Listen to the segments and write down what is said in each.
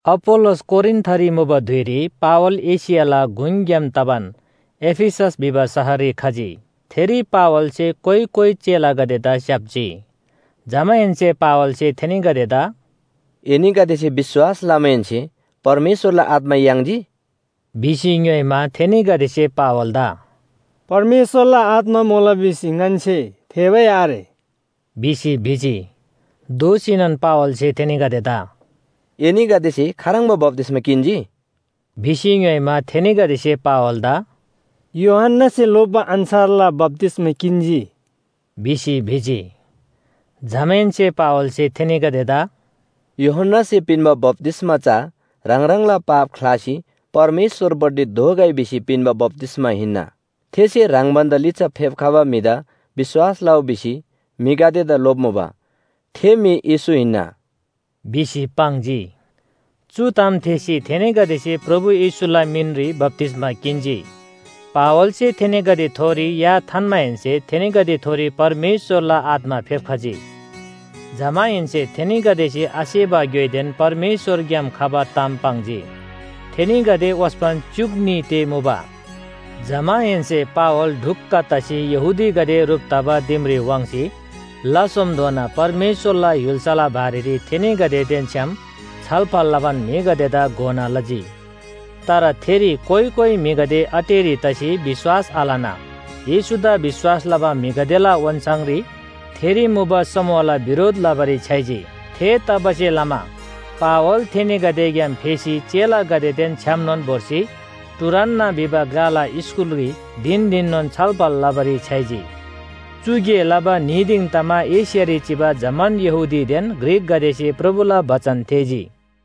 अपोल्‍लोस कोरिन्‍थरी मुबा धुइरी पावल एशियाला गुङग्‍याम तबान एफिसस भिबा शहररी खजी। थेरी पावलसे कोइ कोइ चेलागदेदा स्‍याप्‍जी। जमाहेन्‍से पावलसे थेनीगदेदा “एनीगदेसे विश्‍वास लमाहेन्‍से परमेश्‍वरला आत्‍मा याङ्जी?” भिसी ङ्‌योइमा, थेनीगदेसे पावलदा “परमेश्‍वरला आत्‍मा मुला भिसी ङन्‍से थेःबै आरे” भिसी भिजी। दोःसीनोन पावलसे थेनीगदेदा “एनीगदेसे खाह्रङ्बा बप्‍तिस्‍मा किन्‍जी?” भिसी ङ्‌योइमा, थेनीगदेसे पावलदा “यूहन्‍नासे लोप्‍बा अन्‍छारला बप्‍तिस्‍मा किन्‍जी” भिसी भिजी। जमाहेन्‍से पावलसे थेनीगदेदा “यूहन्‍नासे पिन्‍बा बप्‍तिस्‍मा चा ह्राङ ह्राङला पाप ख्‍लासी परमेश्‍वरपट्टि दोःगै भिसी पिन्‍बा बप्‍तिस्‍मा हिन्‍ना। थेसे ह्राङ भन्‍दा लिच्‍छा फेप्‍खबा म्‍हिदा विश्‍वास लउ भिसी म्‍हिगदेदा लोप्‍मुबा, थे म्‍हि येशू हिन्‍ना” भिसी पाङ्जी। चु ताम थेःसी थेनीगदेसे प्रभु येशूला मिनरी बप्‍तिस्‍मा किन्‍जी। पावलसे थेनीगदेथोरी या थान्‍माहेन्‍से थेनीगदेथोरी परमेश्‍वरला आत्‍मा फेप्‍खजी, जमाहेन्‍से थेनीगदेसे आसेबा ग्‍योइदेन परमेश्‍वरग्‍याम खबा ताम पाङ्जी। थेनीगदे ओस्‍पन च्‍युक न्‍ही ते मुबा। जमाहेन्‍से पावल ढुक्‍क तसी यहूदीगदे ह्रुप तबा दिमरी वाङ्सी ला सोमधोना परमेश्‍वरला य्‍हुल्‍साला बारेरी थेनीगदेदेन छ्‌याम छलफल लबान म्‍हिगदेदा घोना लजी। तर थेरी कोइ कोइ म्‍हिगदे अटेरी तसी विश्‍वास आलना येशूदा विश्‍वास लबा म्‍हिगदेला ओन्‍छाङरी थेरी मुबा समूहला बिरोध लबारी छ्‌याइजी। थेतबासेलमा पावल थेनीगदेग्‍याम फेसी चेलागदेदा छ्‌यामनोन भोर्सी टुरान्‍नस भिबा ग्‍लाला स्‍कूलरी धिन धिननोन छलफल लबारी छ्‌याइजी। चु गे लबा न्‍ही दिङ तमा एशियारी चिबा जम्‍मान यहूदीदेन ग्रीकगदेसे प्रभुला बचन थेःजी।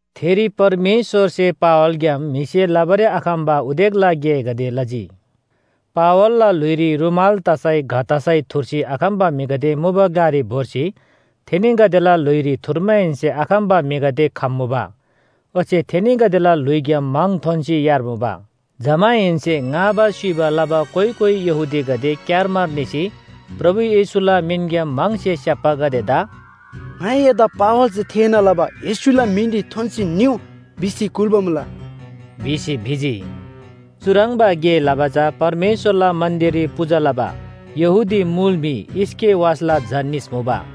थेरी परमेश्‍वरसे पावलग्‍याम म्‍हिसे लबारी आखम्‍बा उदेकला गेगदे लजी। पावलला ल्‍हुइरी रूमाल तसै घ तसै थुर्सी आखम्‍बा म्‍हिगदे मुबा ग्‍लारी भोर्सी थेनीगदेला ल्‍हुइरी थुर्माहेन्‍से आखम्‍बा म्‍हिगदे खम्‍मुबा ओच्‍छे थेनीगदेला ल्‍हुइग्‍याम म्‍हङ थोन्‍सी यार्मुबा। जमाहेन्‍से ङाबा स्‍युइबा लबा कोइ कोइ यहूदीगदे क्‍यारमार निसी प्रभु येशूला मिनग्‍याम म्‍हङसे स्‍याप्‍बागदेदा “ङाइ एदा पावलसे थेःना लबा येशूला मिनरी थोन्‍सी निउ भिसी कुल्‍बा मुला” भिसी भिजी। चुह्रङ्बा गे लबा चा परमेश्‍वरला मन्‍दिररी पूजा लबा यहूदी मुल म्‍हि स्‍केवासला झा निस मुबा।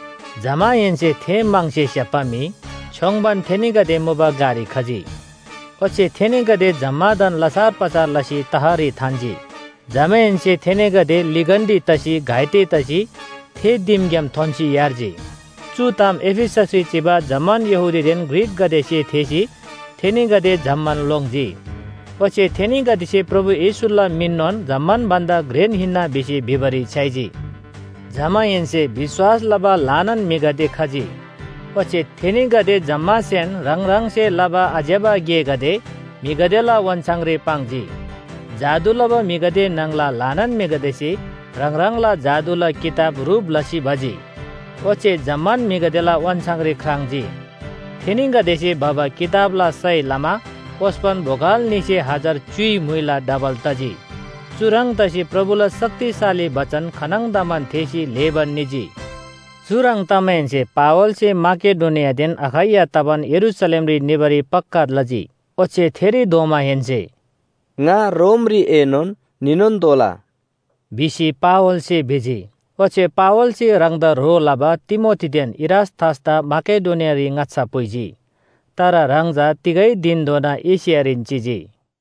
जमाहेन्‍से थे म्‍हङसे स्‍याप्‍बा म्‍हि छ्‌योङ्बान थेनीगदे मुबा ग्‍लारी खजी, ओच्‍छे थेनीगदे जम्‍मादान लछार पछार लसी तहरी थान्‍जी, जमाहेन्‍से थेनीगदे लिगन्‍डी तसी घाइते तसी थे दिमग्‍याम थोन्‍सी यार्जी। चु ताम एफिससरी चिबा जम्‍मान यहूदीदेन ग्रीकगदेसे थेःसी थेनीगदे जम्‍मान लोङ्जी। ओच्‍छे थेनीगदेसे प्रभु येशूला मिननोन जम्‍मान भन्‍दा घ्रेन हिन्‍ना भिसी भिबारी छ्‌याइजी। जमाहेन्‍से विश्‍वास लबा ल्‍हानान म्‍हिगदे खजी ओच्‍छे थेनीगदे जम्‍मासेन ह्राङ ह्राङसे लबा आज्‍यबा गेगदे म्‍हिगदेला ओन्‍छाङरी पाङ्जी। जादु लबा म्‍हिगदे न्‍हङला ल्‍हानान म्‍हिगदेसे ह्राङ ह्राङला जादुला किताब ह्रुप लसी भजी, ओच्‍छे जम्‍मान म्‍हिगदेला ओन्‍छाङरी ख्राङ्‌जी। थेनीगदेसे भबा किताबला सय लमा ओस्‍पन बोगल न्‍हीसे हजार च्‍युइ म्‍हुइला डबल तजी। चुह्रङ् तसी प्रभुला शक्तिशाली बचन खानङदमान थेःसी ल्‍हेबान निजी। चुह्रङ् तमाहेन्‍से पावलसे माकेडोनियादेन अखैया तबान यरूशलेमरी निबारी पक्‍का लजी। ओच्‍छे थेरी धोमाहेन्‍से “ङा रोमरीएनोन निनोन तोःला” भिसी पावलसे भिजी। ओच्‍छे पावलसे ह्राङदा ह्रो लबा तिमोथीदेन इरास्‍तसदा माकेडोनियारी ङाच्‍छा पुइजी। तर ह्राङ चा तिगै धिनधोना एशियारीन चिजी।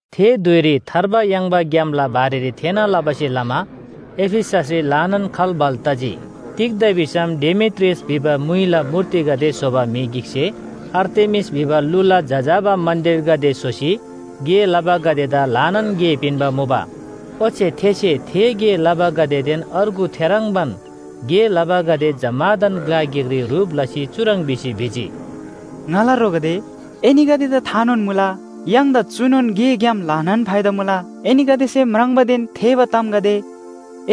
थे धुइरी थार्बा याङ्बा ग्‍यामला बारेरी थेःना लबासे लमा एफिससरी ल्‍हानान खल्‍बल तजी। तिग्‍दा भिसम डेमेत्रियस भिबा म्‍हुइला मूर्तिगदे स्‍होबा म्‍हि गिकसे आर्तेमिस भिबा लुला जजाबा मन्‍दिरगदे स्‍होसी गे लबागदेदा ल्‍हानान गे पिन्‍बा मुबा। ओच्‍छे थेसे थे गे लबागदेदेन अर्गु थेह्रङ्बान गे लबागदे जम्‍मादान ग्‍ला गिकरी ह्रुप लसी चुह्रङ् भिसी भिजी, “ङाला ह्रोगदे, एनीगदेदा थानोन मुला, य्‍हाङदा चुनोन गेग्‍याम ल्‍हानान फाइदा मुला। एनीगदेसे म्राङ्बादेन थेःबा तामगदे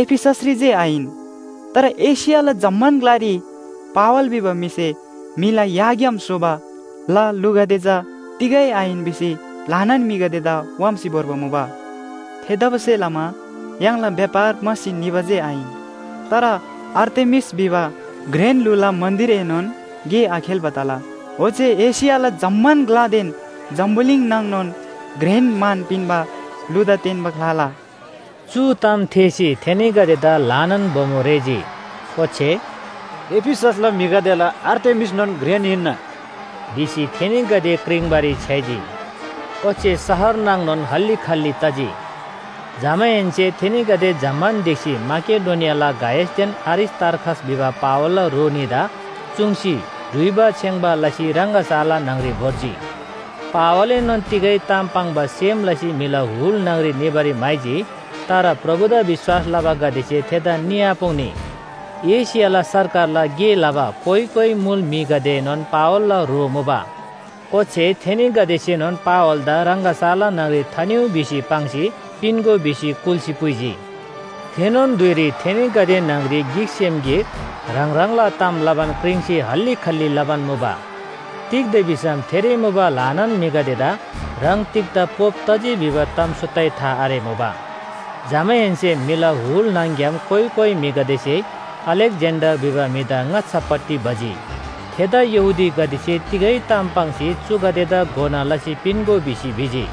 एफिससरी जे आहिन, तर एशियाला जम्‍मान ग्‍लारी पावल भिबा म्‍हिसे म्‍हिला याग्‍याम स्‍होबा ल लुगदे चा तिगै आहिन भिसी ल्‍हानान म्‍हिगदेदा व्‍हाम्‍सी भोर्बा मुबा। थेतबासेलमा य्‍हाङला व्‍यापार म्‍हासी निबा जे आहिन, तर आर्तेमिस भिबा घ्रेन लुला मन्‍दिरएनोन गे आखेल्‍बा तला, ओच्‍छे एशियाला जम्‍मान ग्‍लादेन जम्‍बुलिङ न्‍हङ‌नोन घ्रेन मान पिन्‍बा लुदा तेन्‍बा ख्‍लाला।” चु ताम थेःसी थेनीगदेदा ल्‍हानान बोमो रेःजी, ओच्‍छे “एफिससला म्‍हिगदेला आर्तेमिसनोन घ्रेन हिन्‍ना” भिसी थेनीगदे क्रिङ्बारी छ्‌याइजी। ओच्‍छे शहर न्‍हङ‌नोन हल्‍ली खल्‍ली तजी। जमाहेन्‍से थेनीगदे जम्‍मान ढिक्‍सी माकेडोनियाला गायसदेन अरिस्‍तार्खस भिबा पावलला ह्रो न्‍हीदा चुङ्सी डुइबा छेङ्‌बा लसी रङगशाला न्‍हङरी भोर्जी। पावलएनोन तिगै ताम पाङ्बा सेम लसी म्‍हिला हुल न्‍हङरी निबारी म्‍हाइजी, तर प्रभुदा विश्‍वास लबागदेसे थेदा निआपुङ्‌नी। एशियाला सरकारला गे लबा कोइ कोइ मुल म्‍हिगदेएनोन पावलला ह्रो मुबा। ओच्‍छे थेनीगदेसेनोन पावलदा रङगशाला न्‍हङरी थानिउ भिसी पाङ्सी पिन्‍गो भिसी कुल्‍सी पुइजी। थेनोन धुइरी थेनीगदे न्‍हङरी गिकसेम गिक ह्राङ ह्राङला ताम लबान क्रिङ्सी हल्‍ली खल्‍ली लबान मुबा। तिग्‍दा भिसम थेरी मुबा ल्‍हानान म्‍हिगदेदा ह्राङ तिग्‍दा पोप तजी भिबा ताम सुत्तै था आरेमुबा। जमाहेन्‍से म्‍हिला हुल न्‍हङ‍ग्‍याम कोइ कोइ म्‍हिगदेसे अलेक्‍जेन्‍डर भिबा म्‍हिदा ङाच्‍छापट्टि भजी। थेदा यहूदीगदेसे तिगै ताम पाङ्सी चुगदेदा घोना लसी पिन्‍गो भिसी भिजी।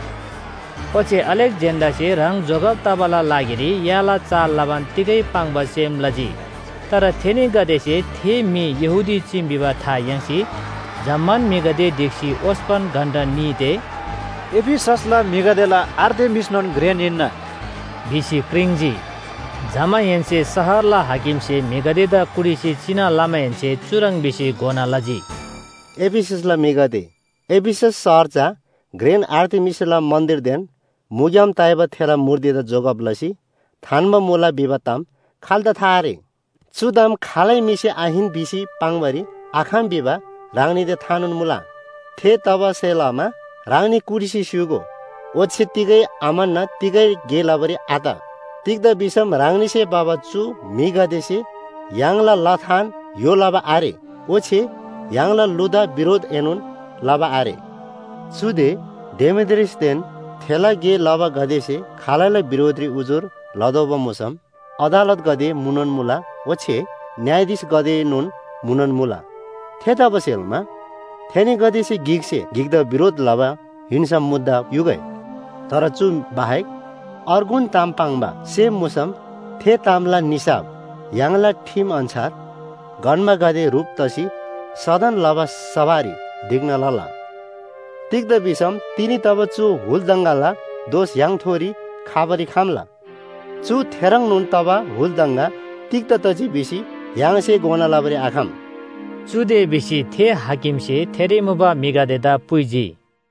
ओच्‍छे अलेक्‍जेन्‍डरसे ह्राङ जोगब तबाला लागिरी याला चाल लबान तिगै पाङ्बा सेम लजी। तर थेनीगदेसे थे म्‍हि यहूदी चीम भिबा था याङ्सी जम्‍मान म्‍हिगदे ढिक्‍सी ओस्‍पन घण्‍टा न्‍ही ते “एफिससला म्‍हिगदेला आर्तेमिसनोन घ्रेन हिन्‍ना” भिसी क्रिङ्‌जी। जमाहेन्‍से शहरला हाकिमसे म्‍हिगदेदा कुटिसी चिना लमाहेन्‍से चुह्रङ् भिसी घोना लजी, “एफिससला म्‍हिगदे, एफिसस शहर चा घ्रेन आर्तेमिसला मन्‍दिरदेन मुग्‍याम ताइबा थेला मूर्तिदा जोगब लसी थान्‍बा मुला भिबा ताम खाल्‍दा था आरे? चु ताम खालै म्‍हिसे आहिन भिसी पाङ्‌बारी आखम भिबा ह्राङनीदा थानोन मुला। थेतबासेलमा ह्राङनी कुटिसी स्‍य्‍हूगो, ओच्‍छे तिगै आम्‍हन्‍ना तिगै गे लबारी आत। तिग्‍दा भिसम ह्राङनीसे भबा चु म्‍हिगदेसे य्‍हाङला लथान य्‍हो लबा आरे, ओच्‍छे य्‍हाङला लुदा बिरोधएनोन लबा आरे। चुदे डेमेत्रियसदेन थेला गे लबागदेसे खालैला बिरोधरी उजुर लतोःबा मुसम अदालतगदे मुनोन मुला ओच्‍छे न्‍यायाधीशगदेएनोन मुनोन मुला। थेतबासेलमा थेनीगदेसे गिकसे गिकदा बिरोध लबा हिन्‍सम मुद्दा युगै। तर चु बाहेक अर्गुन ताम पाङ्बा सेम मुसम थे तामला निसाफ य्‍हाङला ठिम अन्‍छार गन्‍बागदे ह्रुप तसी सदन लबा सभारी ढिक्‍ना लला। तिग्‍दा भिसम तिनी तबा चु हुल दङगाला दोष य्‍हाङथोरी खबारी खम्‍ला, चु थेह्रङ्नोन तबा हुल दङगा तिग्‍दा तजी भिसी य्‍हाङसे घोना लबारी आखम।” चुदे भिसी थे हाकिमसे थेरी मुबा म्‍हिगदेदा पुइजी।